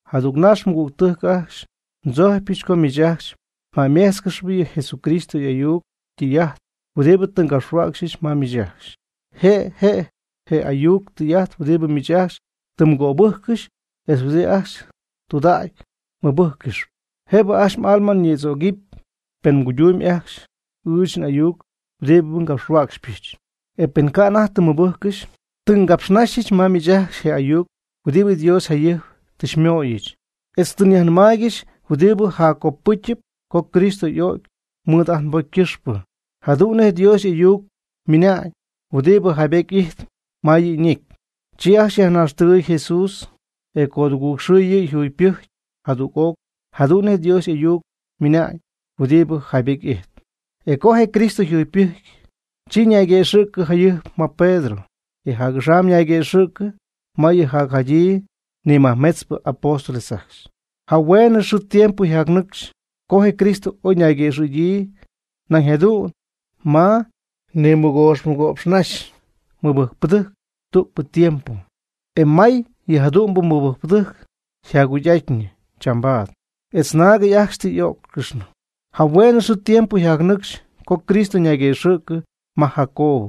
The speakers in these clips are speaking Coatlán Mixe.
Jadügnax, mɨgügtɨjc ajcxy, ndzojcypɨch co miich ajcxy mjäyméjtzcɨxɨpy je Jesucristo y'ayuc ytɨy'ajt huɨdibɨ tɨ ngapxhuäcxyɨch ma miich ajcxy. Je' je' je ayuc tɨy'ajt huɨdibɨ miich ajcxy tɨ mgöbɨjccɨxy etz huɨdi ajcxy tudägy mɨbɨjccɨxyp. Jëbɨ ajcxy m'alma ñïdzögɨpy, pen mguydumyb ajcxy ɨɨch n'ayuc huɨdibɨ ngapxhuäcxypɨch, e pen ca' anajty tɨ mmɨbɨjccɨxy. Tɨ ngapxnaxyɨch ma miich ajcxy je ayuc huɨdibɨ Dios jayɨjp tɨ xymöyɨch, etz tɨ nyajnɨmaaygɨxy huɨdibɨ jaccopɨcyɨp co Cristo y'o'cy mɨɨd ajt nbocy ycɨxpɨ, jadu'n nej Dios y'ayuc ymɨna'ñ huɨdibɨ jaybety ijtp ma yɨ' ñecy. Chi ajcxy yajnaxtɨgɨɨy Jesús, e codugɨɨg xɨɨ yɨ' yjugypɨjcy jadüg'oc jadu'n nej Dios y'ayuc ymɨna'ñ huɨdibɨ jaybety ijtp. E co je Cristo yjugypɨjcy, chi ñayguëxɨ̈cɨ jayɨjp ma Pedro, e jac'axam ñayguëxɨ̈cɨ ma yɨ jacjadyii ni majmetzpɨ apóstol ajcxy. Jahueenɨ xɨɨ tiempo yjacnɨcxy co je Cristo oy ñayguëxɨ̈gyii nañ jadu'n ma mɨgox nimɨgo'pxnaxy mɨbɨjcpɨdɨjc tügpɨ tiempo. E may yɨjadu'mbɨ mɨbɨjcpɨdɨjc jacjugy'ajtnɨ chambaad, etz naagɨty ajcxy tɨ y'ó'ccɨxnɨ. Jahueenɨ xɨɨ tiempo yjacnɨcxy co Cristo ñayguëxɨ̈cɨ ma Jacobo,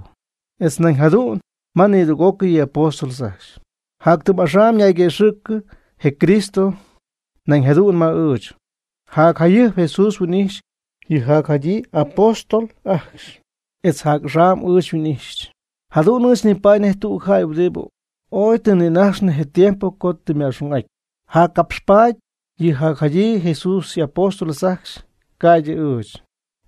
etz nañ jadu'n ma nidüg'ócɨy yɨ' y'apóstol ajcxy. Jac tɨm axam ñayguëxɨ̈cɨ je Cristo nañ jadu'n ma ɨɨch. Jacjayɨjp Jesús huin'ijxy yɨ jacjadyii apóstol ajcxy, etz jac'axam ɨɨch xyhuin'ijxyɨch. Jadu'n ɨɨch nipaady nej tüg jäy huɨdibɨ ooy tɨ nïnajxnɨ je tiempo co tɨ yma'xung'aty. Jaccapxpaady yɨ jacjadyii Jesús y'apóstol ajcxy ca'ydɨ ɨɨch.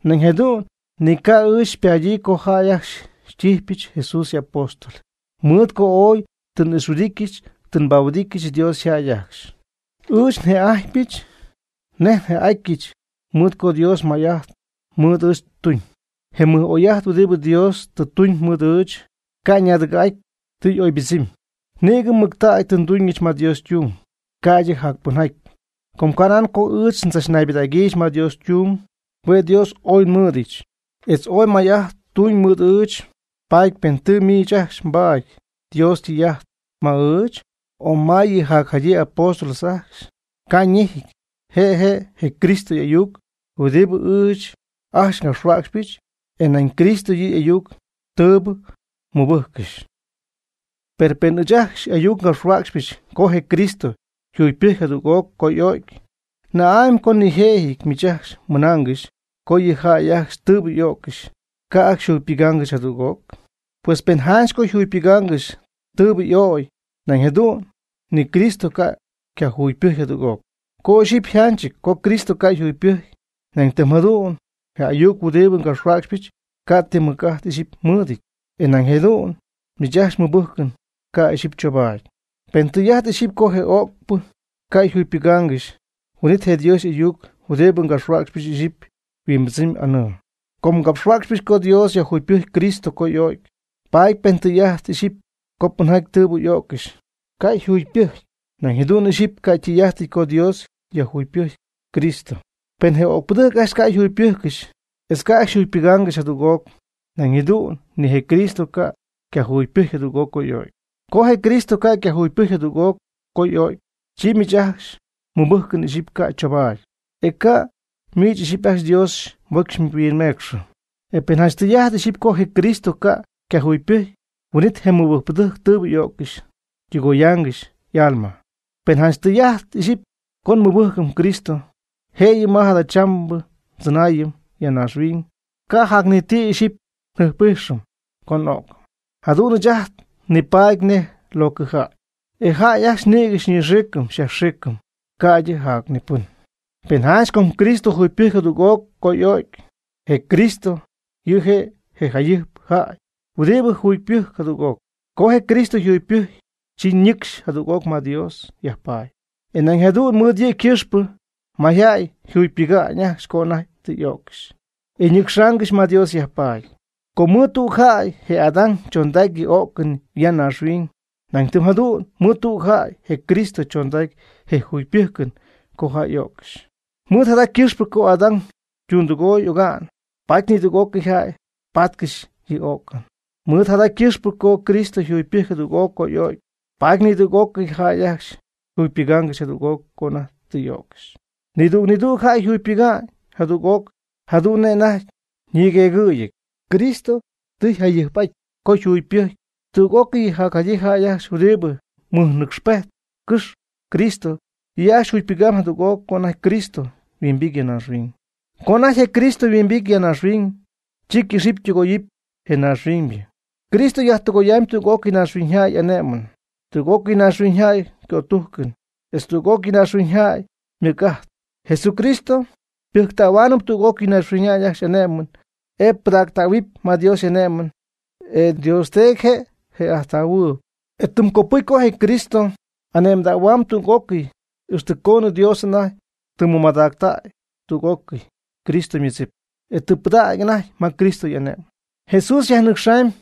Nañ jadu'n ni ca' ɨɨch xypaady co jäy ajcxy xytíjɨbɨch Jesús y'apóstol, mɨɨd co ooy tɨ n'ixhuɨdityɨch tɨ nbahuɨdityɨch Dios yjäy ajcxy. Ɨɨch nje'ajtpɨch nej nje'atyɨch mɨɨd co Dios may'ajt mɨɨd ɨɨch tuñ. Je mɨjmay'ajt je mɨj'oy'ajt huɨdibɨ Dios tɨ tuñ mɨɨd ɨɨch, ca' ñaadɨgɨ̈'aty, tɨ y'oybɨdzɨmyb. Nïgɨ mɨctägy tɨ nduñɨch ma Dios ytung, ca'ydɨ jacpɨnjaty. Ca' nan co ɨɨch ndzachmadägyɨch ma Dios ytung. Hue' Dios oy xymɨɨd'ityɨch, etz ooy may'ajt tuñ mɨɨd ɨɨch. Paady pen tɨ miich ajcxy mbaady Dios ytɨy'ajt ma ɨɨch, o ma yɨ jacjadyii apóstol ajcxy, ca' ñejɨty. Je' je' je Cristo y'ayuc huɨdibɨ ɨɨch ajcxy ngapxhuäcxypɨch, e nañ Cristo yɨ' y'ayuc tɨɨbɨ mmɨbɨjccɨxy. Per pen ɨɨch ajcxy ayuc ngapxhuäcxpɨch co je Cristo yjugypɨjcy jadüg'oc co y'o'cy, ¿na'amy co nijëjɨty miich ajcxy mɨnaangɨxy co yɨ jäy ajcxy tɨɨbɨ y'o'ccɨxy ca' ajcxy yjugypɨgaangɨxy jadüg'oc? Pues pen janch ca' yjugypɨgaangɨxy tɨɨbɨ y'o'cy, nañ jadu'n ni Cristo ca' ycayjugypɨjcy jadüg'oc. Co ixyipy yjanchɨty co Cristo ca' yjugypɨjcy, nañ tɨm jadu'n je ayuc huɨdibɨ ngapxhuäcxypɨch ca' ti mɨc'ajt ixyipy mɨɨdɨty. E nañ jadu'n miich ajcxy mmɨbɨjcɨn ca' ixyipy chobaady. Pen tɨy'ajt ixyipy co je öcpɨ ca' yjugypɨgaangɨxy, huin'it je Dios y'ayuc huɨdibɨ ngapxhuäcxpɨch ixyipy yhuimbɨdzɨmyb anɨɨ. Com ngapxhuäcxpɨch co Dios yajjugypɨjcy Cristo co y'o'cy, paady pen tɨy'ajt ixyipy co pɨnjaty tɨɨbɨ y'o'ccɨxy ca' yjugypɨjcy. Nañ jadu'n ixyipy ca' ytɨy'ajtɨty co Dios yjugypɨjcy Cristo. Pen je öcpɨdɨjc ajcxy ca' jugypɨjccɨxy etz ca' ajcxy yjugypɨgaangɨxy jadüg'oc, nañ jadu'n ni je Cristo ca' ycajugypɨjcy jadüg'oc co y'o'cy. Co je Cristo ca' ycayjugypɨjcy jadüg'oc co y'o'cy, chi miich ajcxy mmɨbɨjcɨn ixyipy ca' choobaady. E ca' miich ixyipy ajcxy Dios mbocy xyhuinmecxɨ. E pen janch tɨy'ajt ixyipy co je Cristo ca' ycajugypɨjcy, huin'it je mɨbɨjcpɨdɨjc tɨɨbɨ y'o'ccɨxy tɨgoyaangɨxy y'alma. Pen janch tɨy'ajt ixyipy co nmɨbɨjcɨm Cristo jëyɨ ma jadachambɨ tzɨnaayɨn ya naaxhuiñ, ca' jac ni ti ixyipy njɨjp'ijxɨm co n'o'cɨm. Jadu'n ɨɨch ajt nipaady nej locɨjäy, e jäy ajcxy nïgɨ xyñɨxiicɨm xyajxiicɨm, ca'ydɨ jac ni pɨn. Per janch co Cristo yjugypɨjcy jadüg'oc co y'o'cy, je Cristo yɨ' je' je jayɨjp jäy huɨdibɨ jugypɨjc jadüg'oc. Co je Cristo yjugypɨjcy, chi ñɨcxy jadüg'oc ma Dios yajpaady, e nañ jadu'n mɨɨd yɨ' ycɨxpɨ mayjäy yjugypɨga'ñ ajcxy co anajty tɨ y'öccɨxy, e yñɨcxaangɨxy ma Dios yajpaady. Com mɨɨd tüg jäy, je Adán, chondacy yɨ o'cɨn ya naaxhuiñ. Nañ tɨm jadu'n mɨɨd tüg jäy, je Cristo, chondacy je jugypɨjcɨn co jäy y'o'ccɨxy. Mɨɨd jada ycɨxpɨ co Adán ytundɨgooy oga'n, paady nidüg'ócɨy jäy patcɨxy yɨ o'cɨn. Mɨɨd jada ycɨxpɨ co Cristo yjugypɨjcy jadüg'oc co y'o'cy, paady nidüg'ócɨy jäy ajcxy yjugypɨgaangɨxy jadüg'oc co anajty tɨ y'öccɨxy. Nidüg nidüg jäy yjugypɨga'ñ jadüg'oc jadu'n nej anajty ñigueegɨ̈yii. Cristo tɨ yjayɨjp'aty co yjugypɨjcy. Tüg'ócɨy yɨ jacjadyii jäy ajcxy huɨdibɨ mɨjnɨcxpejtcɨxp Cristo, yɨ' ajcxy jugypɨgamb jadüg'oc co anajty Cristo yhuimbity ya naaxhuiñ. Co anajty je Cristo yhuimbity ya naaxhuiñ, chi ycɨxɨpy ytɨgoyɨpy je naaxhuiñybɨ. Cristo yajtɨgoyamyb tüg'ócɨy naaxhuiñyjäy y'ane'mɨn, tüg'ócɨy naaxhuiñyjäy ycötujcɨn, etz tüg'ócɨy naaxhuiñyjäy ymɨc'ajt. Jesucristo ypɨjctähuaanɨp tüg'ócɨy naaxhuiñyjäy ajcxy y'ane'mɨn, e pɨdactähuɨpy ma Dios y'ane'mɨn, e Dios Teedy je' je'ajttähuɨɨb. E tɨm copɨcy co je Cristo y'ane'mdähuamyb tüg'ócɨy, ixtɨ coonɨ Dios anajty tɨ mɨmadactäy tüg'ócɨy Cristo ymɨdzip, e tɨ pɨdactäy anajty ma Cristo y'ane'mɨn. Jesús yajcɨxamyb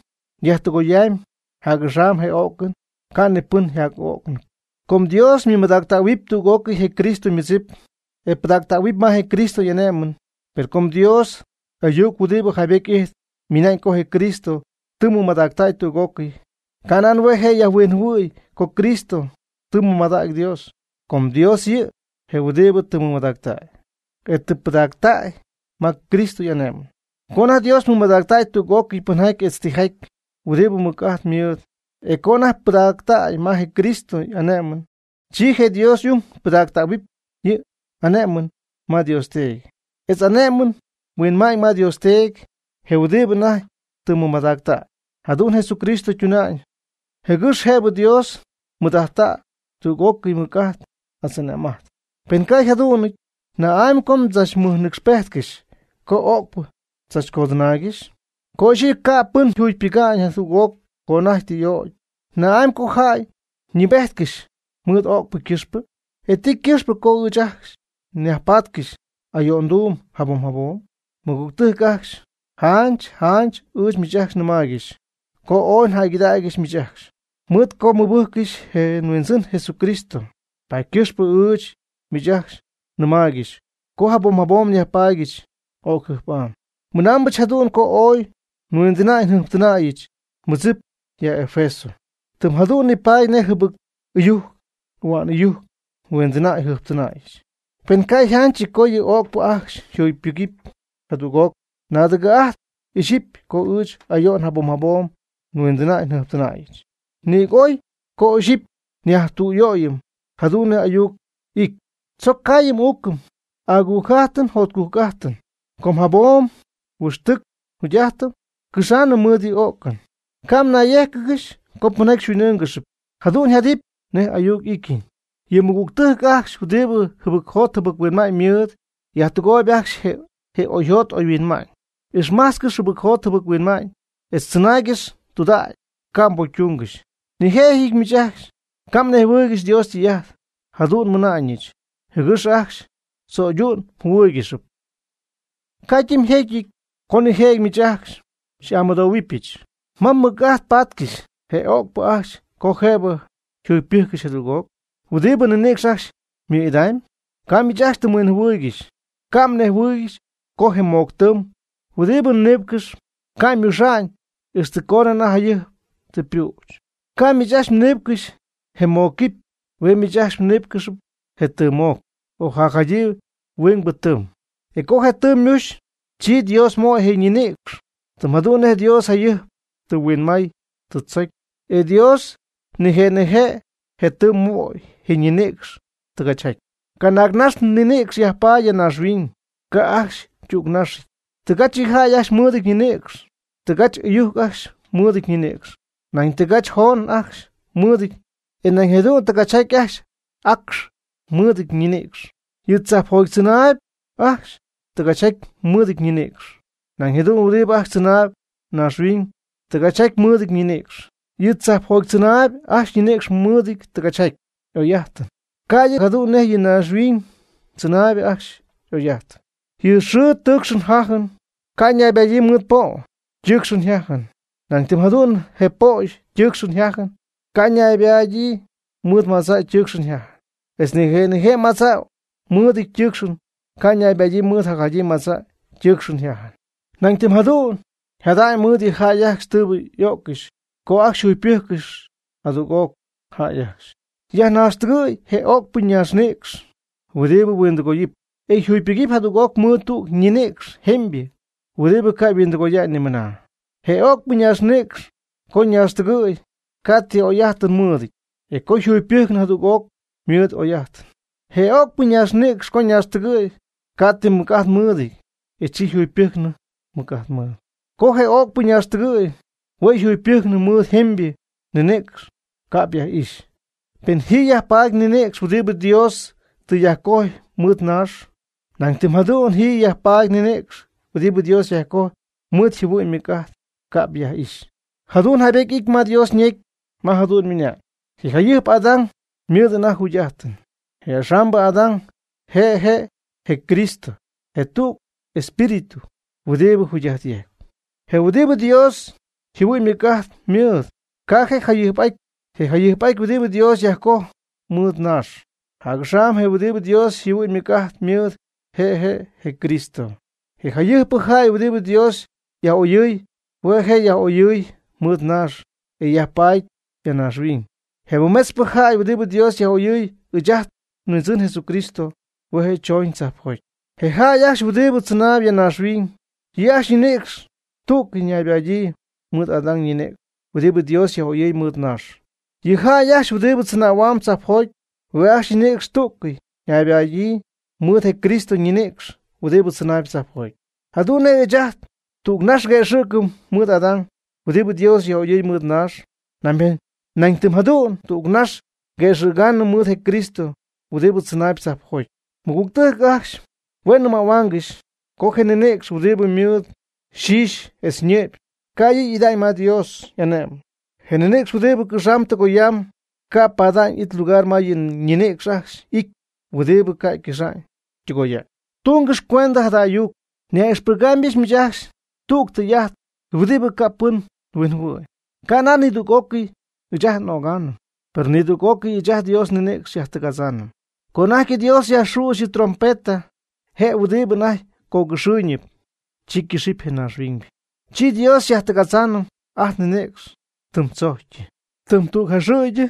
yajtɨgoyamyb jac'axam je o'cɨn, ca' ni pɨn yjac'öcnɨpy. Com Dios ymɨmadactähuɨp tüg'ócɨy je Cristo ymɨdzip, e pɨdactähuɨp ma je Cristo y'ane'mɨn. Per co Dios y'ayuc huɨdibɨ jaybety ijtp ymɨna'ñ co je Cristo tɨ mɨmadactäy tüg'ócɨy, ca' nan hue' je' yajhuinjɨhuɨ̈y co Cristo tɨ mɨmadägy Dios. Com Dios yɨ' je' huɨdibɨ tɨ mɨmadactäy, e tɨ pɨdactäy ma Cristo y'ane'mɨn. Co anajty Dios mɨmadactay tüg'ócɨy pɨnjaty etz tijaty huɨdibɨ mɨc'ajt mɨɨd, e co anajty pɨdactay ma je Cristo y'ane'mɨn, chi je Dios y'ung ypɨdactähuɨpy yɨ' y'ane'mɨn ma Dios Teedy, etz ane'my yhuɨ'ma'ñ ma Dios Teedy, je huɨdibɨ anajty tɨ mɨmadactay. Jadu'n Jesucristo tuna'ñ, jɨgɨx jëbɨ Dios mɨɨd'ajttäy tüg'ócɨy mɨc'ajt etz ane'm'ajt. Pen ca' yjadu'nɨty, ¿na'amy co mdzachnɨɨbejtcɨxy co öcpɨ tzachcodɨnaaygɨxy? Co ixyipy ca' pɨn yjugypɨga'ñ jadüg'oc co anajty tɨ y'o'cy, ¿na'amy co jäy ñɨɨbejtcɨxy mɨɨd öcpɨ ycɨxpɨ? ¿E ti ycɨxpɨ co ɨɨch ajcxy nyajpatcɨxy ayo'nduum jabom jabom? Mɨgügtɨjc ajcxy, janch janch ɨɨch miich ajcxy nɨmaaygɨxy co ooy njäygɨdägyɨch miich ajcxy. Mɨɨd co mmɨbɨjccɨxy je nHuindzɨn Jesucristo, paady ycɨxpɨ ɨɨch miich ajcxy nɨmaaygɨxy co jabom jabom nyajpaadyɨch öcjɨjp'am. Mɨnaambɨch jadu'n co ooy nhuindɨnäy njɨjptɨnäyɨch nmɨdzip ya Efeso. Tɨm jadu'n nipaady nej jɨbɨc ɨyujc ahua'n ɨyujc nhuindɨnäy njɨjptɨnäyɨch. Pen ca' yjanchɨty co yɨ öcpɨ ajcxy yjugypɨgɨpy jadüg'oc, naadɨgɨ̈'ajtp ixyipy co ɨɨch ayo'n jabom jabom nhuindɨnäy njɨjptɨnäyɨch. Nïg oy co ixyipy nyajtüyöyɨm jadu'n nej ayuc y'ityɨn: “Tzoc caayɨm uucɨm, agujc'ajtɨm jotcujc'ajtɨm, com jabom huɨxtɨc njugy'ajtɨn ycɨxaanɨm mɨɨd yɨ o'cɨn.” Ca' mnayyéjcɨgɨxy co pɨnjaty xyhuin'ɨ́ɨngɨxɨpy. Jadu'n yjadɨpy nej y'ayuc y'ityɨn: “Yɨ mɨgügtɨjc ajcxy huɨdibɨ jɨbɨcjot jɨbɨc-huinma'ñ mɨɨd, yajtɨgooyb ajcxy je oyjot oyhuinma'ñ.” Ixmajtzcɨx jɨbɨcjot jɨbɨc-huinma'ñ etz tzɨnaaygɨx tudägy ca' mbocytungɨxy. Nijëjɨty miich ajcxy ca' mnejhuɨɨygɨxy Dios ytɨy'ajt. Jadu'n nmɨna'ñɨch, jɨgɨx ajcxy mdzo'ydu'n mjɨhuɨ́ɨygɨxɨpy. Ycadɨmjecyɨty co nijëjɨty miich ajcxy xy'amɨdohuɨpyɨch: “¿Ma mɨc'ajt pátcɨxɨpy je o'cpɨ ajcxy co jëbɨ yjugypɨjccɨxy jadüg'oc? ¿Huɨdibɨ ninïcx ajcxy ymɨ'idamyb?” Ca' miich ajcxy ti mhuinjɨhuɨɨygɨxy. Ca' mnejhuɨɨygɨxy co je moc tɨɨm huɨdibɨ mniipcɨxyp ca' ymuxa'ñ ixtɨ coonɨ anajty jayɨjp tɨ ypüch. Ca' miich ajcxy mniipcɨxy je mocquipy. Hue' miich ajcxy mniipcɨxyp je tɨɨmmoc o jacjadyii huingbɨ tɨɨm. E co je tɨɨm ymuxy, chi Dios möy je ñinïcx, tɨm jadu'n nej Dios jayɨjp tɨ huinmay tɨ tzocy. E Dios nije' nije' je tɨɨm möy je ñinïcx tɨgachjaty. Canaagnax ninïcx yajpaady ya naaxhuiñ, ca' ajcxy ytügnaxɨty. Tɨgach yɨ jäy ajcxy mɨɨdɨty ñinïcx, tɨgachjaty ɨyujc ajcxy mɨɨdɨty ñinïcx, nañ tɨgachjaty joon ajcxy mɨɨdɨty ñinïcx, e nañ jadu'n tɨgachjaty acx ajcxy mɨɨdɨty ñinïcx. Yɨ tzajpjoty tzɨnaayb ajcxy tɨgachjaty mɨɨdɨty ñinïcx, nañ jadu'n huɨdibɨ ajcxy tzɨnaayb naaxhuiñ tɨgachjaty mɨɨdɨty ñinïcx. Yɨ tzajpjoty tzɨnaayb ajcxy ñinïcx mɨɨd tɨgachjaty y'oy'ajtɨn, ca'ydɨ jadu'n nej yɨ naaxhuiñ tzɨnaayb ajcxy y'oy'ajtɨn. Yɨ xɨɨ ytɨɨcxɨn yjajɨn ca' ñaybadyii mɨɨd po' ytɨɨcxɨn yjajɨn, nañ tɨm jadu'n je po' ytɨɨcxɨn yjajɨn ca' ñaybadyii mɨɨd madza' ytɨɨcxɨn yjajɨn. Etz nije' nije' madza' mɨɨdɨty ytɨɨcxɨn ca' ñaybadyii mɨɨd jacjadyii madza' ytɨɨcxɨn yjajɨn. Nañ tɨm jadu'n yjada'ñ mɨɨd yɨ jäy ajcxy tɨɨbɨ y'o'ccɨxy co ajcxy yjugypɨjccɨxy jadüg'oc. Jäy ajcxy yajnaxtɨgɨy je öcpɨ naaxnïcx huɨdibɨ yhuindɨgooyɨpy, e yjugypɨgɨpy jadüg'oc mɨɨd tüg ñinïcx jemybɨ huɨdibɨ ca' yhuindɨgoya'ñ nimɨna. Je öcpɨ ñaaxnïcx co ñaaxtɨgɨ̈y, ca' ti oy'ajtɨn mɨɨdɨty, e co yjugypɨjcnɨ jadüg'oc ymɨɨd y'oy'ajtɨn. Je öcpɨ ñaaxnïcx co ñaxtɨgɨ̈y, ca' ti mɨc'ajt mɨɨdɨty e chi yjugypɨjcnɨp mɨc'ajt mɨɨd. Co je öcpɨ ñaaxtɨgɨɨy, hue' yjugypɨjcnɨ, mɨɨd jemybɨ ninïcx ca'p yaj'ixy. Pen ji yajpaady ninïcx huɨdibɨ Dios tɨ yajcojy mɨɨd naax, nañ tɨm jadu'n ji yajpaady ninïcx huɨdibɨ Dios yajcojpy mɨɨd yjɨhuɨ'ñ ymɨc'ajt ca'p yaj'ixy. Jadu'n jaybety y'ity ma Dios ñecy ma jadu'n ymɨna'ñ: “Je jayɨjp Adán ymɨɨd anajty jugy'ajtɨn.” Je axambɨ Adán (je' je' je Cristo) je' tüg espíritu huɨdibɨ jugy'ajt yejcp. Je huɨdibɨ Dios yjɨhuɨ'ñ ymɨc'ajt mɨɨd ca' je' yjayɨjp'ajty, je' jayɨjp'ajt huɨdi Dios yajcoj mɨɨd naax; jac'axam je' huɨdibɨ Dios yjɨhuɨ'ñ ymɨc'ajt mɨɨd, je' je' je Cristo. Je jayɨjpɨ jäy huɨdibɨ Dios yaj'oyɨɨy, hue' je' yaj'oyɨy mɨɨd naax (e yajpaady ya naaxhuiñ). Je mɨmetzpɨ jäy huɨdibɨ Dios yaj'oyɨy, ɨɨch ajt nHuindzɨn Jesucristo, hue' je' chooñ tzajpjoty. Je jäy ajcxy huɨdibɨ tzɨnaayb ya naaxhuiñ, yɨ' ajcxy ñinïcx tú'cɨy ñaybadyii mɨɨd Adán ñinïcx huɨdibɨ Dios yaj'oyɨɨy mɨɨd naax. Yɨ jäy ajcxy huɨdibɨ tzɨnähuamb tzajpjoty, hue' ajcxy ñinïcx tú'cɨy ñaybada'ñyii mɨɨd je Cristo ñinïcx huɨdibɨ tzɨnaayb tzajpjoty. Jadu'n nej ɨɨch ajt, tügnax nguëxɨ̈cɨm mɨɨd Adán huɨdibɨ Dios yaj'oyɨy mɨɨd naax. Nañ tɨm jadu'n tügnax nguëxɨ̈gaanɨm mɨɨd je Cristo huɨdibɨ tzɨnaayb tzajpjoty. Mɨgügtɨjc ajcxy, hue' nnɨmähuaangɨxy co je ninïcx huɨdibɨ mɨɨd yxixy etz yñɨ'py ca' yɨ' y'ida'ñ ma Dios y'ane'my. Je ninïcx huɨdibɨ cɨxamb tɨgoyamb ca' pada'ñ it lugar ma yɨ ñinïcx ajcxy ity huɨdibɨ ca' ycɨxa'ñ ytɨgoya'ñ. Tungɨx cuendɨ jada ayuc, nyaj'ixpɨgaamybɨch miich ajcxy tüg tɨy'ajt huɨdibɨ ca' pɨn huinjɨhuɨ̈y. Ca' nan nidüg'ócɨy ɨɨch ajt n'ögaanɨm, per nidüg'ócɨy ɨɨch ajt Dios nninïcx xyajtɨgadzaanɨm. Co anajty Dios yajxüxy yɨ' ytrompeta, je huɨdibɨ anajty cogɨxɨɨyñɨp, chi cɨxɨpy je naaxhuiñybɨ. Chi Dios xyajtɨgadzaanɨm ajt nninïcx tɨm tzojcyɨ, tɨm tüg jaxɨ̈gy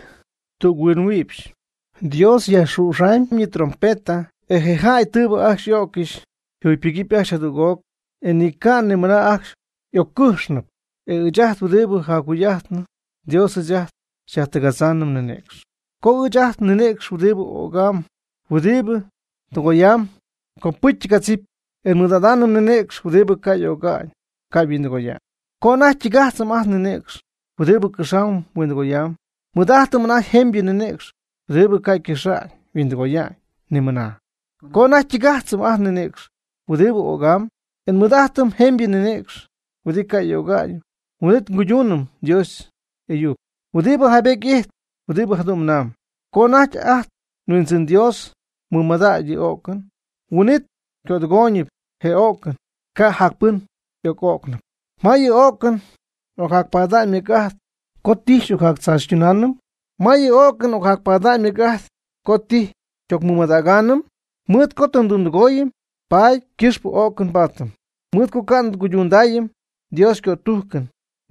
tüg huinmïpxy. Dios yajxüxamyb yɨ' ytrompeta, e je jäy tɨɨbɨ ajcxy y'öccɨxy jugypɨgɨp ajcxy jadüg'oc, e ni ca mɨna ajcxy y'öccɨxnɨpy. E ɨɨch ajt huɨdibɨ jacjugy'ajtnɨ Dios ɨɨch ajt xyajtɨgadzáanɨm nninïcx. Com ɨɨch ajt nninïcx huɨdibɨ ögam, huɨdibɨ huen tɨgoyamb, copɨcy ytɨgadzip, e nmɨɨd'adaanɨm ninïcx huɨdibɨ ca' öga'ñ ca' yhuindɨgoya'ñ. Co anajty ytɨgajtzɨm ajt nninïcx huɨdibɨ cɨxamb huindɨgoyamb, nmɨɨd'ajtɨm anajty jemybɨ ninïcx huɨdibɨ ca' ycɨxa'ñ yhuindɨgoya'ñ nimɨna. Co anajty ytɨgajtzɨm ajt nninïcx huɨdibɨ ögam, e nmɨɨd'ajtɨm jemybɨ ninïcx huɨdibɨ ca' y'öga'ñ, huin'it cuydunɨpy Dios y'ayuc huɨdibɨ jaybety ijtp huɨdibɨ jadu'n ymɨnamb: “Co anajty ajt nHuindzɨn Dios mɨmadägy yɨ o'cɨn, huin'it cödɨgooyñɨp je o'cɨn (ca' jacpɨn y'oc'o'cnɨp). ¿Ma yɨ o'cɨn ocjacpada'ñ mɨc'ajt co tijy xy'ocjactzaachytunaanɨm? ¿Ma yɨ o'cɨn ocjacpada'ñ mɨc'ajt co tijy xy'ocmɨmadägaanɨm?” Mɨɨd co tɨ ndundɨgooyɨm, paady ycɨxp o'cɨn nbaatɨm. Mɨɨd co ca' tɨ nguydundaayɨm Dios ycötujcɨn,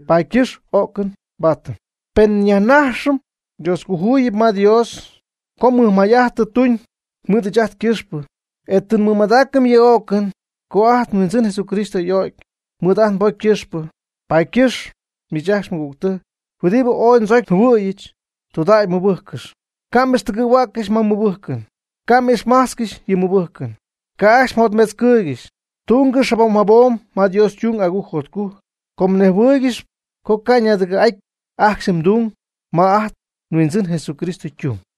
paady ycɨxp o'cɨn nbaatɨm. Per nyajnajxɨm Dioscojuyip ma Dios co mɨjmay'ajt tɨ tuuñ mɨɨd ɨɨch ajt ycɨxpɨ, e tɨ nmɨmadaacɨm yɨ o'cɨn co ajt nHuindzɨn Jesucristo y'o'cy mɨɨd ajt nbocy ycɨxpɨ. Paady ycɨxp, miich ajcxy mɨgügtɨjc huɨdibɨ ooy ndzocy njɨhuɨ̈yɨch tɨydudägy mmɨbɨjccɨx, ca' m'ixtɨgɨ̈huäccɨxy ma mmɨbɨjcɨn, ca' m'ixmajtzcɨxy yɨ mmɨbɨjcɨn, ca' ajcxy mjotmetzcɨɨygɨxy. Tungɨx jabom jabom ma Dios ytung agujc jotcujc, com mnejhuɨɨygɨxyp co ca' ñaadɨgɨ̈'aty ajcxy mdung ma ajt nHuindzɨn Jesucristo ytung.